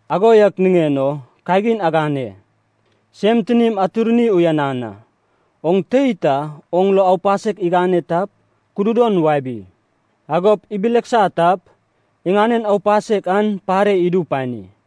Ago yak niŋen o kagin agane, sem tinim atirni uyanan a! “Oŋ tei ta oŋ lo aupasek igane tap, kududon wabi. Agop ibileksa tap, iŋanen aupasek an pare idu pani.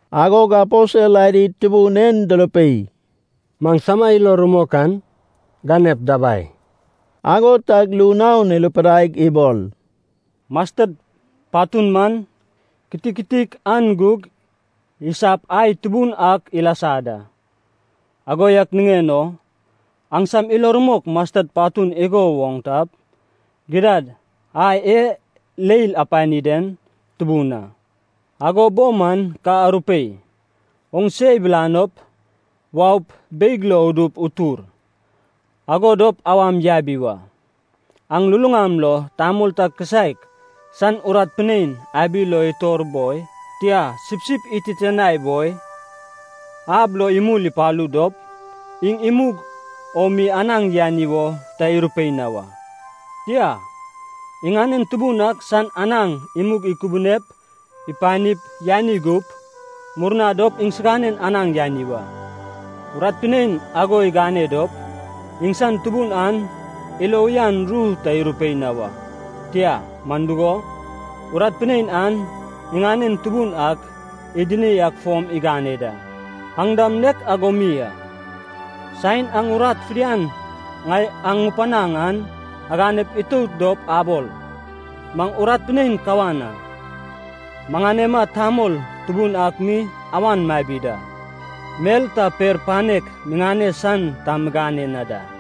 Agog aposel adi Tubun en durupei, “Maŋsama ilo rumok an ganep dabai.” Ago tag ru naon irupidaig ibol, “Masted patun man kitiktik an gug isap ai tubun ak ilasa da. Ago yak niŋen o aŋsam ilo rumok masted patun igo woŋ tap, gidad ai e leil apani den tubun a, ago bo man ka arupei, ‘Oŋ se ibilanop, waup, beig lo udup utur,’ ago dop awam yabi wa. “Aŋ luluŋam lo tamol ta kisaek san urat pinein abi lo itor boi, tia, sipsip ititianai boi, ab lo imul ipalu dop, iŋ imug o mi anaŋ yani wo ta irupei na wa. Tia, iŋanen tubun ak san anaŋ imug ikubunep ipanip, yani gup, murna dop iŋsinanen anaŋ yani wa. Urat pinein ago igane dop, iŋsan tubun an ilo uyan ru ta irupei na wa. Tia. Man dugo, urat pinein an iŋanen tubun ak idini ak fom igane da. Aŋ dam nek ago mi a. Saen aŋ urat fidian ŋai aŋ ŋupanaŋ an aganep itout dop abol, ‘Maŋ urat pinein kawan a. Maŋanema tamol tubun ak mi awan mabi da, mel ta per panek miŋane san ta migane na da.’”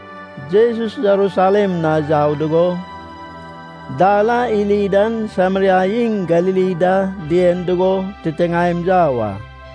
Jesus Jerusalem na yau dugo dal a iri dan Sameria iŋ Galili da dien dugo titiŋaem yau a.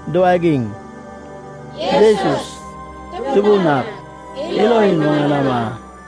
duwagiŋ, “Jesus, Tubun ak, ilo imuŋanama.”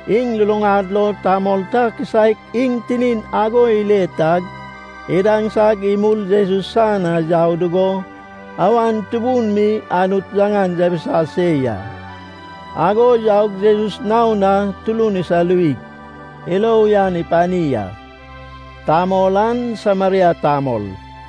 Iŋ luluŋad lo tamol ta kisaek iŋ tinin ago ile tag, idaŋsag imul Jesus san na yau dugo, awan tubun mi Anut yaŋan yabisa se ya. Agog yaug Jesus naon na turun isaluwig, ilo uyan ipani a. Tamol an Sameria tamol.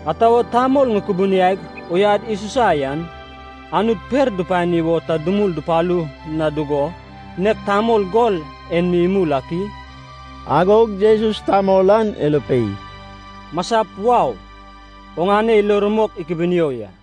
Ata wo tamol ŋukubuniaig uyad isusa yan, Anut per dupani wo ta dumul dupalu na dugo, nek tamol gol en mi imul ak i?” Agog Jesus tamol an irupei, “Masap wau. Oŋane ilo rumok ikubunio ya.”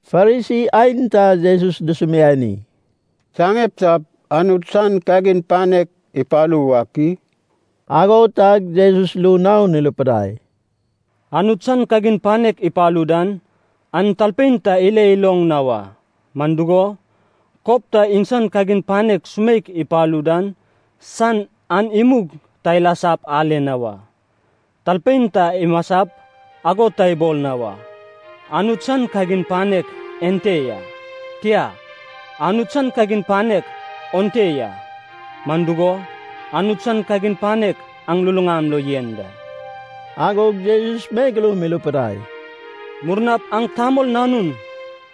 Farisi aenta Jesus dusumiani, “Saŋeptap Anut san kagin panek ipalu wak i?” Ago tag Jesus ru naon irupidai, “Anut san kagin panek ipalu dan, an talpein ta ile iloŋ na wa, man dugo, kob ta iŋsan kagin panek sumeik ipalu dan san an imug ta ilasap ale na wa. Talpein ta imasap igo ta ibol na wa, ‘Anut san kagin panek ente ya.’ Tia, ‘Anut san kagin panek onte ya.’ Man dugo, Anut san kagin panek aŋ luluŋam lo yen da.” Agog Jesus megeloum irupidai, “Murnap aŋ Tamol Nanun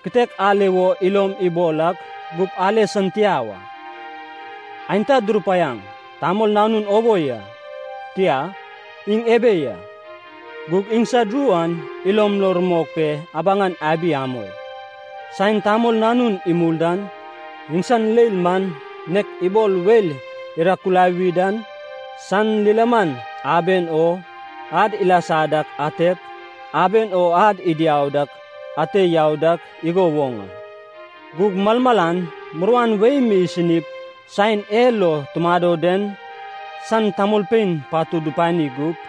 kitek ale wo ilom ibol ak gup ale san tia wa. Aenta durupaiaŋ, ‘Tamol Nanun obo ya.’ Tia, ‘Iŋ ebe ya.’ Gug iŋsad ru an ilom lo rumok pe abaŋan abi amoi. Saen Tamol Nanun imul dan, iŋsan leil man nek ibol weil irakulawi dan, san lilaman aben o ad ilasa dak atep, aben o ad idiau dak ate yau dak igo woŋ a. Gug malmalan muruan wei mi isinip saen e lo tumado den san tamolpein patud dupani gup.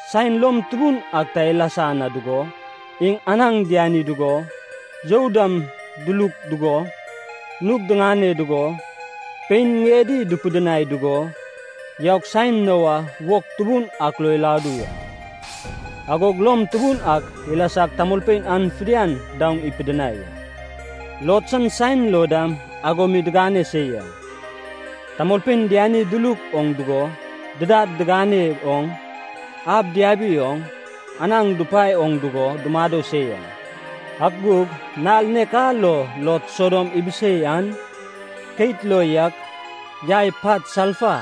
Saen lom tubun ak ta ilasa na dugo, iŋ anaŋ diani dugo, you dam duluk dugo, nug diŋane dugo, pein ŋiedi dupidinai dugo, yaug saen Noa wog tubun ak lo iladu ya. Agog lom tubun ak ilasag tamolpein an fidian daoŋ ipidinai a. “Lot san saen lo dam ago mi digane se ya. Tamolpein diani duluk oŋ dugo, didad diŋane oŋ, ab diabi oŋ, anaŋ dupae oŋ dugo dumado se ya. Ak gug nal nek a lo Lot Sodom ibisei an, keit lo yak yai pat salfa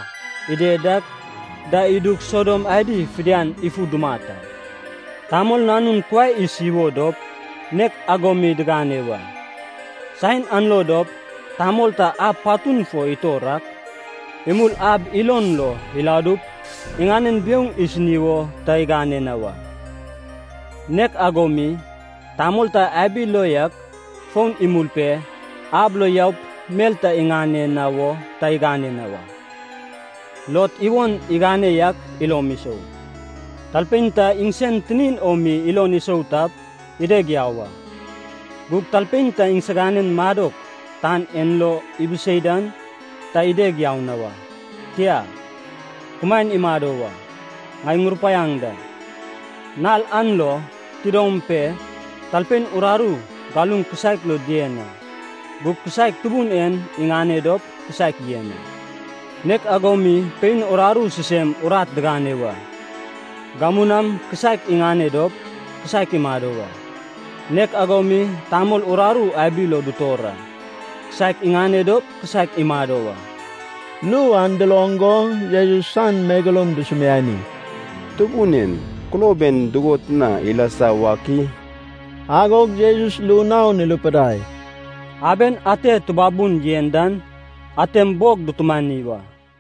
ided dak da idug Sodom adi fidian ifu dumat a. “Tamol Nanun kuai isi wo dop nek ago mi digane wa. Saen an lo dop tamol ta ab patun fo itor ak imul ab ilon lo iladup, iŋanen biouŋ isini wo ta igane na wa. Nek ago mi, tamol ta abi lo yak fon imul pe, ab lo yaup mel ta iŋane wo ta igane na wa. Lot iwon igane yak ilom isou. Talpein ta iŋsen tinin o mi ilon isou tap, ideg yau a. Gug talpein ta siganen madok tan en lo ibisei dan, ta ideg yau na wa, tia, kumaen imado wa. Ŋai ŋurupaiaŋ da. Nal an lo, tidom pe talpein uraru galuŋ kisaek lo dien a, gug kisaek Tubun en iŋane dop, kisaek yen a. Nek ago mi pein uraru sisem urat digane wa. Gamu nam kisaek iŋane dop, kisaek imado wa. Nek ago mi tamol uraru abi lo dutor a. Kisaek iŋane dop, kisaek imado wa.” Ru an duloŋ go Jesus san megeloum dusumiani, “Tubun en. Kulob en dugot na ilasa wak i?” Agog Jesus ru naon irupidai, “Aben ate tubabun yen dan, antem bog dutumani wa.”